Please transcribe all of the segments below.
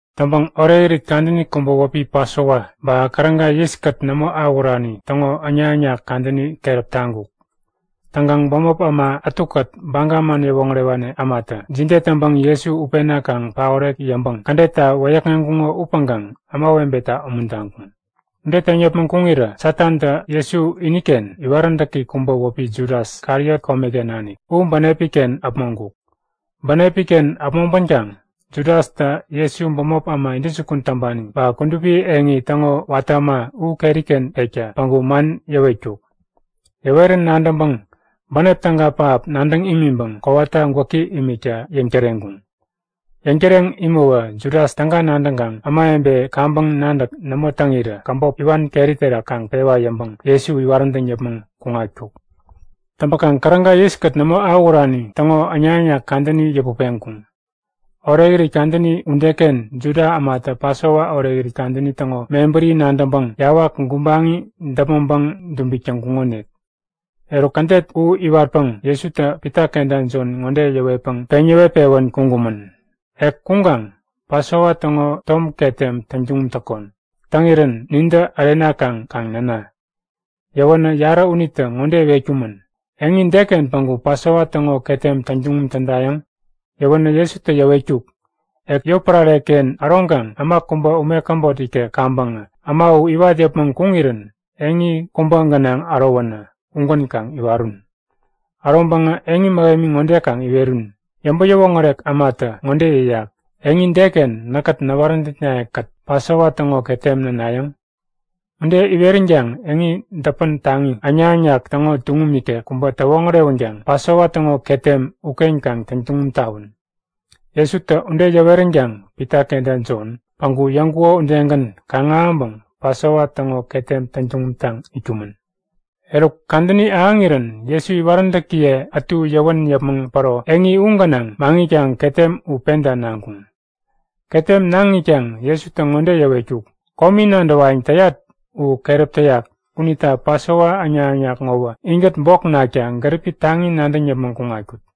Täŋpäŋ orekirit kadäni kubä wäpi Pasova ba Käräga yiskät nämo awähurani täŋo äŋnak-äŋnak kadäni keräp taŋkuk. Täŋkaŋ bämop äma ätukät Baga man yäwoŋärewani ämatä jide täŋpäŋ Jesu utpena kaŋ paorek yäŋpäŋ kädetta wäyäkŋeŋkuŋo upäŋkaŋ ämawebeta umuntaŋkuŋ. Ude täŋ yäpmäŋ kuŋirä Satantä Jesu iniken iwaräntäki kubä wäpi Judas, Kariot komeken nanik, u bänepi-ken äpmoŋkuk. Bänepi-ken äpmoŋpänkaŋ Judastä Jesu bämop äma intäjukun täŋpani ba kudupi eŋi täŋo watä äma u keri-ken pekta päŋku man yäwetkuk. Yäwerän nadäŋpäŋ bänep täga pähap nadäŋ imiŋpäŋ kowata gwäki imikta yäŋtäreŋkuŋ. Yäŋtäreŋ imäwä Judas täga nadäŋkaŋ ämawebe kaŋpäŋ nadäk nämo täŋirä käbop iwan keri terak kaŋ pewa yäŋpäŋ Jesu iwaräntäŋ yäpmäŋ kuŋatkuk. Täŋpäkaŋ Käräga yiskät nämo awähurani täŋo äŋnak-äŋnak kadäni yäput peŋkuŋ. Orekirit kadäni udeken Juda ämatä Pasova orekirit kadäni täŋo mebäri nadäŋpäŋ yawak gubaŋi däpmäŋpäŋ dubik täŋkuŋonik. Eruk, kädet u iwatpäŋ Jesutä Pita kenta Jon ŋode yäwetpäŋ peŋ yäwet-pewän kuŋkumän; Ek kuŋkaŋ Pasova täŋo tom ketem täŋ tuŋum täkon. Täŋirän nintä ärenakaŋ kaŋ näna. Yäwänä yarä unitä ŋode iwetkumän; Eŋi deken päŋku Pasova täŋo ketem täŋtuŋum tädayäŋ? Yäwänä Jesutä yäwetkuk; Ek yotpärare-ken äroŋkaŋ äma kubä ume käbot ikek kaŋpäŋä äma u iwat yäpmäŋ kuŋirän eŋi kubä gänaŋ ärowänä ugän kaŋ iwarun. Äroŋpäŋä eŋi mähemi ŋode kaŋ iwerun; Yäŋpäŋ-yäwoŋärek ämatä ŋode yäyak; Eŋi deken näkkät näwaräntäknaye-kät Pasova täŋo ketem nänayäŋ? Ude iweränkaŋ eŋi däpän taŋi, äŋnak-äŋnak täŋo tuŋum ikek kubä täwoŋärewänkaŋ Pasova täŋo ketem uken kaŋ täŋtuŋum tawun. Jesutä ude yäweränkaŋ Pita kenta Jon päŋku yäŋkuko udegän kaŋ-ahäŋpäŋ Pasova täŋo ketem täŋtuŋum taŋ itkumän. Eruk kadäni ahäŋirän Jesu iwaräntäkiye ätu yäwän yäpmäŋ päro eŋi u gänaŋ maŋitkaŋ ketem u penta naŋkuŋ. Ketem naŋ itkaŋ Jesutä ŋode yäwetkuk; Komi nadäwayäŋ täyat u keräp täyak unita Pasova äŋnak-äŋnak ŋowä inkät bok nakta gäripi taŋi nadäŋ yäpmäŋ kuŋatkut.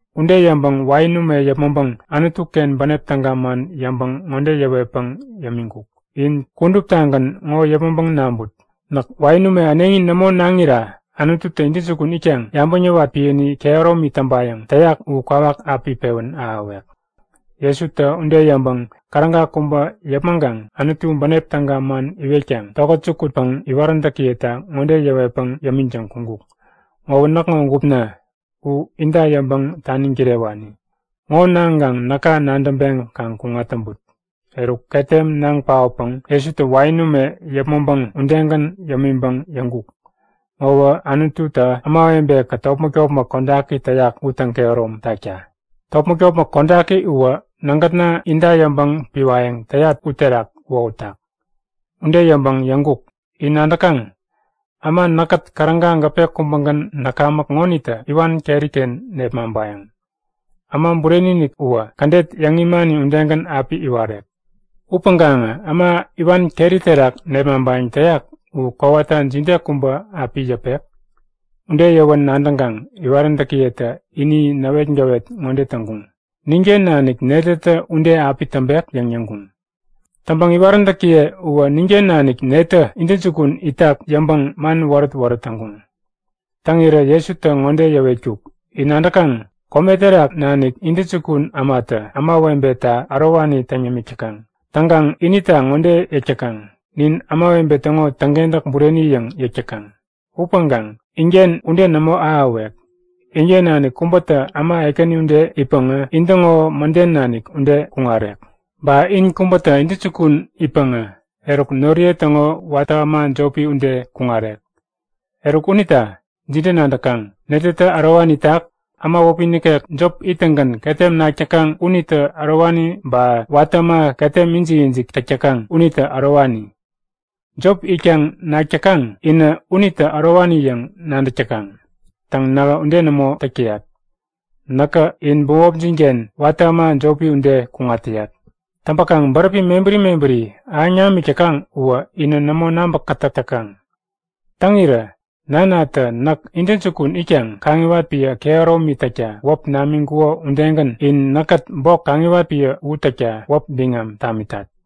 Ude yäŋpäŋ wain ume yäpmäŋpäŋ Anutu-ken bänep täga man yäŋpäŋ ŋode yäwetpäŋ yämiŋkuk; In kuduptagän ŋo yäpmäŋpäŋ naŋput. Näk wain ume äneŋi nämo naŋira Anututä intäjukun itkaŋ yabäŋ yäwat piäni kehäromi täŋpayäŋ täyak u kwawak api pewän ahäwek. Jesutä ude yäŋpäŋ käräga kubä yäpmäŋkaŋ Anutu bänep täga man iwetkaŋ tokät jukutpäŋ iwaräntäkiyeta ŋode yäwetpäŋ yämiŋtäŋ kuŋkuk; Ŋowä näkŋo gupna. U inta yäŋpäŋ taniŋ kirewani. Ŋo naŋkaŋ näka nadäŋpeŋ kaŋ kuŋat täŋput. Eruk ketem naŋ paotpäŋ Jesutä wain ume yäpmäŋpäŋ udegän yämiŋpäŋ yäŋkuk; Ŋowä Anututä ämawebe-kät topmäk-topmäk kodaki täyak u täŋkehärom takta. Topmäk-topmäk kodaki uwä nägätna inta yäŋpäŋ piwayäŋ täyat uterak wohutak. Ude yäŋpäŋ yäŋkuk; In nadäkaŋ? Äma näkkät käräga gäpe kubägän näkamäk ŋonitä iwan keri-ken nepmaŋpayäŋ. Äma Bureni-inik uwä kädet yäŋ imani udegän api iwarek. Upäŋkaŋä äma iwan keri terak nepmaŋpayäŋ täyak u kowata jide kubä api yäpek? Ude yäwän nadäŋkaŋ iwaräntäkiyetä ini näwetgäwet ŋode täŋkuŋ; Ninken nanik netätä ude api täŋpek? yäŋ yäŋkuŋ. Täŋpäŋ iwaräntäkiye uwä ninken nanik netä intäjukun itak yäŋpäŋ man wärät-wärät täŋkuŋ. Täŋirä Jesutä ŋode yäwetkuk; In nadäkaŋ? Kome terak nanik intäjukun ämatä ämawebeta ärowani täŋ yämik täkaŋ. Täŋkaŋ inita ŋode yäk täkaŋ; Nin ämawebe täŋo täŋkentäk bureni yäŋ yäk täkaŋ. Upäŋkaŋ inken ude nämo ahäwek. Inken nanik kubätä äma ekäni ude itpäŋä intäŋo mäden nanik ude kuŋarek. Ba in kubätä intäjukun itpäŋä eruk noriye täŋo watä äma jopi ude kuŋarek. Eruk, unita jide nadäkaŋ? Netätä ärowani itak? Äma wäpi nikek jop ittäŋgän ketem nak täkaŋ unitä ärowani ba, watä äma ketem ijik-ijik täk täkaŋ unitä ärowani? Jop itkaŋ nak täkaŋ inä unitä ärowani yäŋ nadäk täkaŋ. Täŋ, nähä ude nämo täk täyat. Näkä in bämopjin-ken watä äma jopi ude kuŋat täyat. Täŋpäkaŋ bäräpi mebäri mebäri ahäŋ namik täkaŋ uwä inä nämo nabäkätäk täkaŋ. Täŋirä nanatä näk intäjukun itkaŋ kaŋiwat piä kehäromi täkta wäp namiŋkuko udegän in näkkät bok kaŋiwat piä u täkta wäp biŋam tamitat.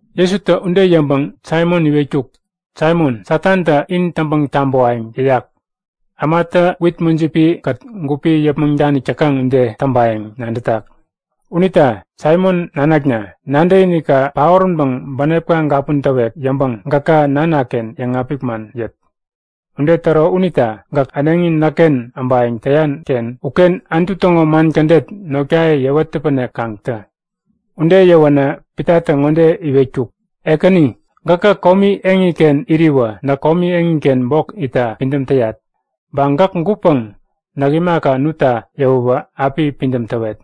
Jesutä ude yäŋpäŋ Saimon iwetkuk; Saimon, Satantä in täŋpäŋ-tabäwayäŋ yäyak. Ämatä wit mujipi-kät gupi yäpmäŋ danik täkaŋ ude täŋpayäŋ nadätak. Unita Saimon nanakna, nadäkinikka paoränpäŋ bänepka gapun täwek yäŋpäŋ gäka Nanaken yäŋapik man yät. Ude täro unita gäk äneŋi näkken äbayäŋ täyan-ken uken Anutu täŋo man kädet notkaye yäwet täpänek kaŋ tä. Ude yäwänä Pitatä ŋode iwetkuk; Ekäni gäkä komi eŋiken iriwä näk komi eŋiken bok itta pidäm täyat. Ba gäk gutpäŋ näk imaka nutta yäwäwä api pidäm täwet.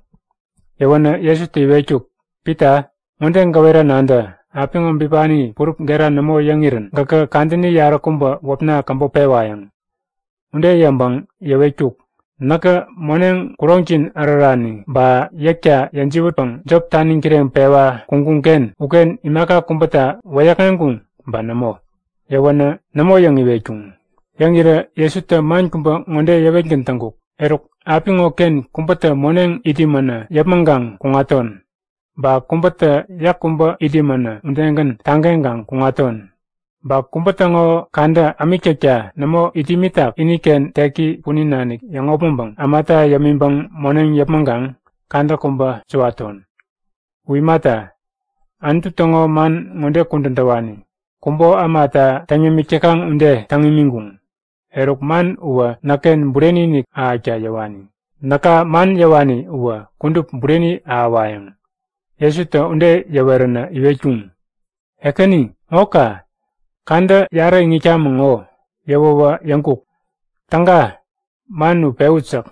Yäwänä Jesutä iwetkuk; Pita, ŋode gäwera nadä. Apiŋo bipani purup gera nämo yäŋirän gäkä kadäni yaräkubä wäpna käbop pewayäŋ. Ude yäŋpäŋ yäwetkuk; Näkä moneŋ, kuroŋjin ärärani ba yäkta yäjiwätpäŋ jop taniŋ kireŋpewa kuŋkuŋ-ken uken imaka kubäta wäyäkŋeŋkuŋ ba nämo? Yäwänä Nämo yäŋ iwetkuŋ. Yäŋirä Jesutä man kubä ŋode yäwetgän täŋkuk; Eruk apiŋo-ken kubätä moneŋ it imänä yäpmäŋkaŋ kuŋaton. Ba kubätä yäk kubä it imänä udegän tageŋkaŋ kuŋaton. Ba kubä täŋo kadä ämik täkta nämo it imänä iniken teki punin nanik yäŋopmäŋpäŋ ämata yämiŋpäŋ moneŋ yäpmäŋkaŋ kadä kubä suwaton. U imata, Anutu täŋo man ŋode kudän täwani; Kubo ämata täŋ yämik täkaŋ ude täŋ imiŋkuŋ. Eruk, man uwä näkken bureni-inik ahäkta yäwani. Näka man yäwani uwä kudup bureni ahäwayäŋ. Jesutä ude yäweränä iwetkuŋ; Ekäni, ŋo ka! Kadä yarä iŋitkamäŋ ŋo! Yäwäwä yäŋkuk; Täga, man u pewut! yäk.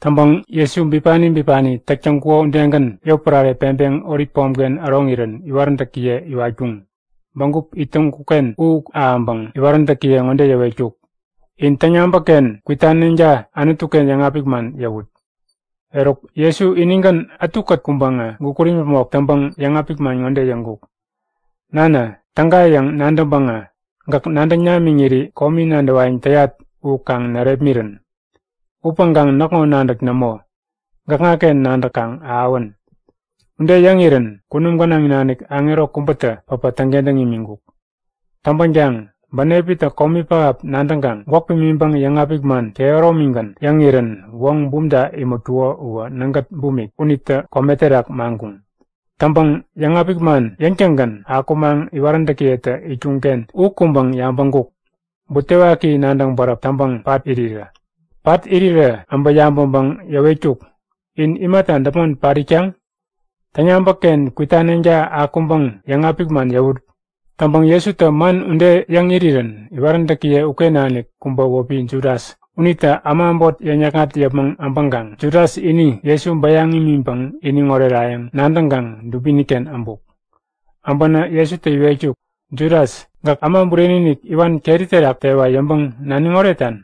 Täŋpäŋ Jesu bipani bipani täk täŋkuko udegän yotpärare peŋpeŋ Olip pomken äroŋirän iwaräntäkiye iwatkuŋ. Bägup it täŋkuk-ken u ahäŋpäŋ iwaräntäkiye ŋode yäwetkuk; In täŋyabäk-ken kwitaneŋta Anutu-ken yäŋapik man yäwut. Eruk Jesu inigän ätukät kuŋpäŋä gukut imäpmok täŋpäŋ yäŋapik man ŋode yäŋkuk; Nana, täga yäŋ nadäŋpäŋä gäk nadäŋ namiŋiri komi nadäwayäŋ täyat u kaŋ närepmirän. Upäŋkaŋ näkŋo nadäk nämo, gäkŋaken nadäk kaŋ ahäwän. Ude yäŋirän kunum gänaŋ nanik aŋero kubätä päpä täŋkentäŋ imiŋkuk. Täŋpänkaŋ bänepitä komi pähap nadäŋkaŋ gwäk pimiŋpäŋ yäŋapik man kehäromigän yäŋirän woŋ bumta imätkuko uwä nägät bumik unitä kome terak maŋkuŋ. Täŋpäŋ yäŋapik man yäŋtäŋgän akumaŋ iwaräntäkiyetä itkuŋ-ken u kuŋpäŋ yabäŋkuk; Butewaki nadäŋ bäräp täŋpäŋ pat irirä. Pat irirä äbä yabäŋpäŋ yäwetkuk; In imata däpmon pat itkaŋ? Täŋyabäk-ken kwitaneŋta akuŋpäŋ yäŋapik man yäwut! Täŋpäŋ Jesutä man ude yäŋ irirän iwaräntäkiye uken nanik kubä wäpi Judas unitä äma äbot yäŋ-yäkŋat yäpmäŋ äbäŋkaŋ Judas ini Jesu bayäŋ imiŋpäŋ iniŋ orerayäŋ nadäŋkaŋ dubini-ken äbuk. Äbänä Jesutä iwetkuk; Judas, gäk Äma Bureni-inik iwan keri terak tewa yäŋpäŋ naniŋ oretan?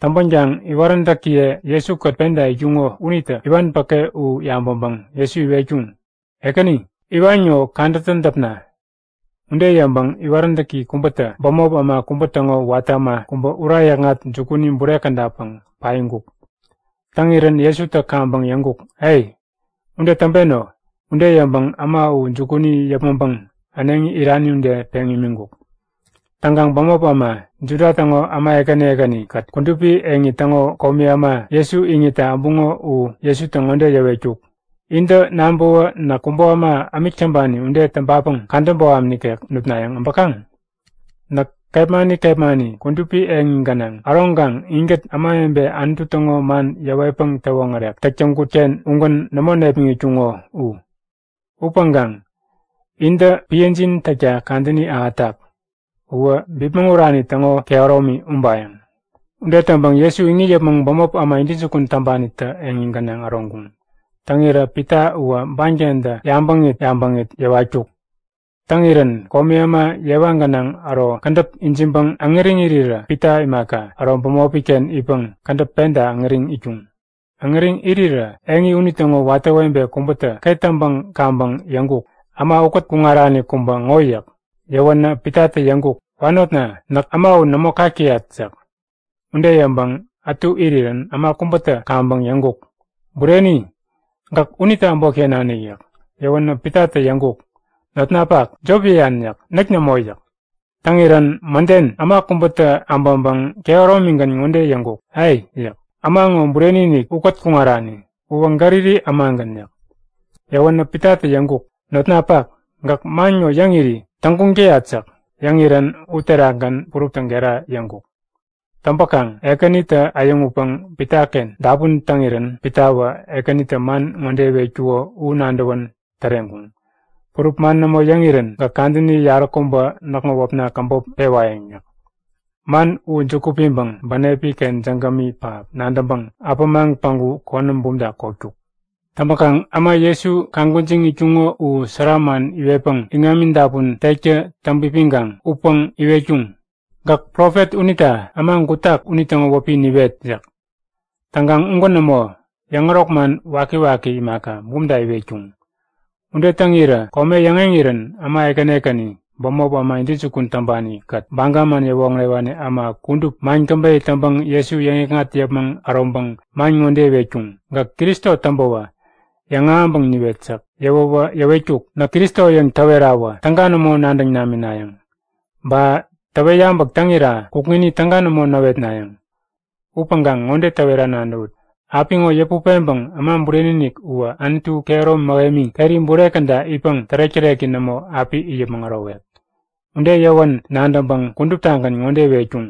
Täŋpänkaŋ iwaräntäkiye Jesu-kät penta itkuŋo unitä iwan päke u yabäŋpäŋ Jesu iwetkuŋ; Ekäni, iwan ŋo kadätä däpna? Ude yäŋpäŋ iwaräntäki kubätä bämop äma kubä täŋo watä äma kubä ura yäkŋat jukuni bure kädapäŋ paiŋkuk. Täŋirän Jesutä kaŋpäŋ yäŋkuk; Ai! Ude täŋpeno! Ude yäŋpäŋ äma u jukuni yäpmäŋpäŋ äneŋi irani ude peŋ imiŋkuk. Täŋkaŋ bämop äma, Juda täŋo äma ekäni ekäni-kät kudupi eŋi täŋo komi äma Jesu iŋitta äbuŋo u Jesutä ŋode yäwetkuk; Intä nabäwä näk kubo äma ämik täŋpani ude täŋpapäŋ kadä boham nikek nutnayäŋ äbäkaŋ? Näk kepmani kepmani kudupi eŋi gänaŋ äroŋkaŋ inkät ämawebe Anutu täŋo man yäwetpäŋ yäwoŋärek täk täŋkut-ken ugän nämo nepmäŋitkuŋo u. Upäŋkaŋ intä piäjin täkta kadäni ahätak. Uwä bipmäŋ urani täŋo kehäromi ubayäŋ! Ude täŋpäŋ Jesu iŋit yäpmäŋ bämop äma intäjukun täŋpanitä eŋi gänaŋ äroŋkuŋ. Täŋirä Pita uwä bankentä yabäŋit yabäŋit yäwatkuk. Täŋirän komi äma yewa gänaŋ äro kädäp ijiŋpäŋ äŋäriŋ irirä Pita imaka, äro bämopi-ken itpäŋ kädäp penta äŋäriŋ itkuŋ. Äŋäriŋ irirä eŋi unitäŋo watä webe kubätä ket täŋpäŋ kaŋpäŋ yäŋkuk; Äma ukät kuŋarani kubä ŋo yäk. Yäwänä Pitatä yäŋkuk; Wanotna, näk äma u nämo kak täyat yäk. Ude yäŋpäŋ ätu irirän äma kubätä kaŋpäŋ yäŋkuk; Bureni, gäk unitä äbotken nanik yäk. Yäwänä Pitatä yäŋkuk; Notnapak, jop yäyan yäk. Näk nämo! Täŋirän mäden äma kubätä äbäŋpäŋ kehäromigän ŋode yäŋkuk; A! yäk. Äma ŋo bureni-inik ukät kuŋarani. Uwä Galili ämagän yäk. Yäwänä Pitatä yäŋkuk; Notnapak, gäk man ŋo yäŋiri täŋguŋ täyat yäk. Yäŋirän uterakgän puruptä gera yäŋkuk. Täŋpäkaŋ Ekänitä äyäŋutpäŋ Pitaken dapun täŋirän Pitawä Ekänitä man ŋode iwetkuko u nadäwän täreŋkuŋ; Purup man nämo yäŋirän gäk kadäni yaräkubä näkŋo wäpna käbop pewayäŋ yäk. Man u juku piŋpäŋ bänepi-ken jägämi pähap nadäŋpäŋ äpämaŋ päŋku konäm bumta kotkuk. Täŋpäkaŋ äma Jesu kaŋ gwäjiŋ itkuŋo u sära man iwetpäŋ iŋami dapun tektä täŋpipiŋkaŋ utpäŋ iwetkuŋ; Gäk profet unita äma gutak unitäŋo wäpi niwet! yäk. Täŋkaŋ ugän nämo. Yäŋärok man wakiwaki imaka, bumta iwetkuŋ. Ude täŋirä kome yäŋeŋirän äma ekäni ekäni, bämop äma intäjukun täŋpani-kät Baga man yäwoŋärewani äma kudup man käbeyä täŋpäŋ Jesu yäŋikŋat yäpmäŋ äroŋpäŋ man ŋode iwetkuŋ; Gäk Kristo täŋpäwä yäŋahäŋpäŋ niwet yäk. Yäwäwä yäwetkuk; Näk Kristo yäŋ täwerawä täga nämo nadäŋ naminayäŋ. Ba täwet yabäk täŋira kukŋini täga nämo näwetnayäŋ. Upäŋkaŋ ŋode täwera nadäwut; Apiŋo yäput peŋpäŋ Äma Bureni-inik uwä Anutu kehäromi mähemi keri bure käda itpäŋ tärek-täreki nämo api it yäpmäŋ ärowek. Ude yäwän nadäŋpäŋ kuduptagän ŋode iwetkuŋ;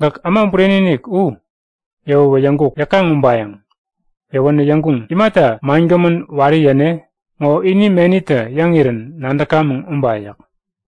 Gäk Äma Bureni-inik u? Yäwäwä yäŋkuk; Yäkaŋ ubayäŋ. Yäwänä yäŋkuŋ; Imata mangämän wari yäne? Ŋo ini menitä yäŋirän nadäkamäŋ uba yäk.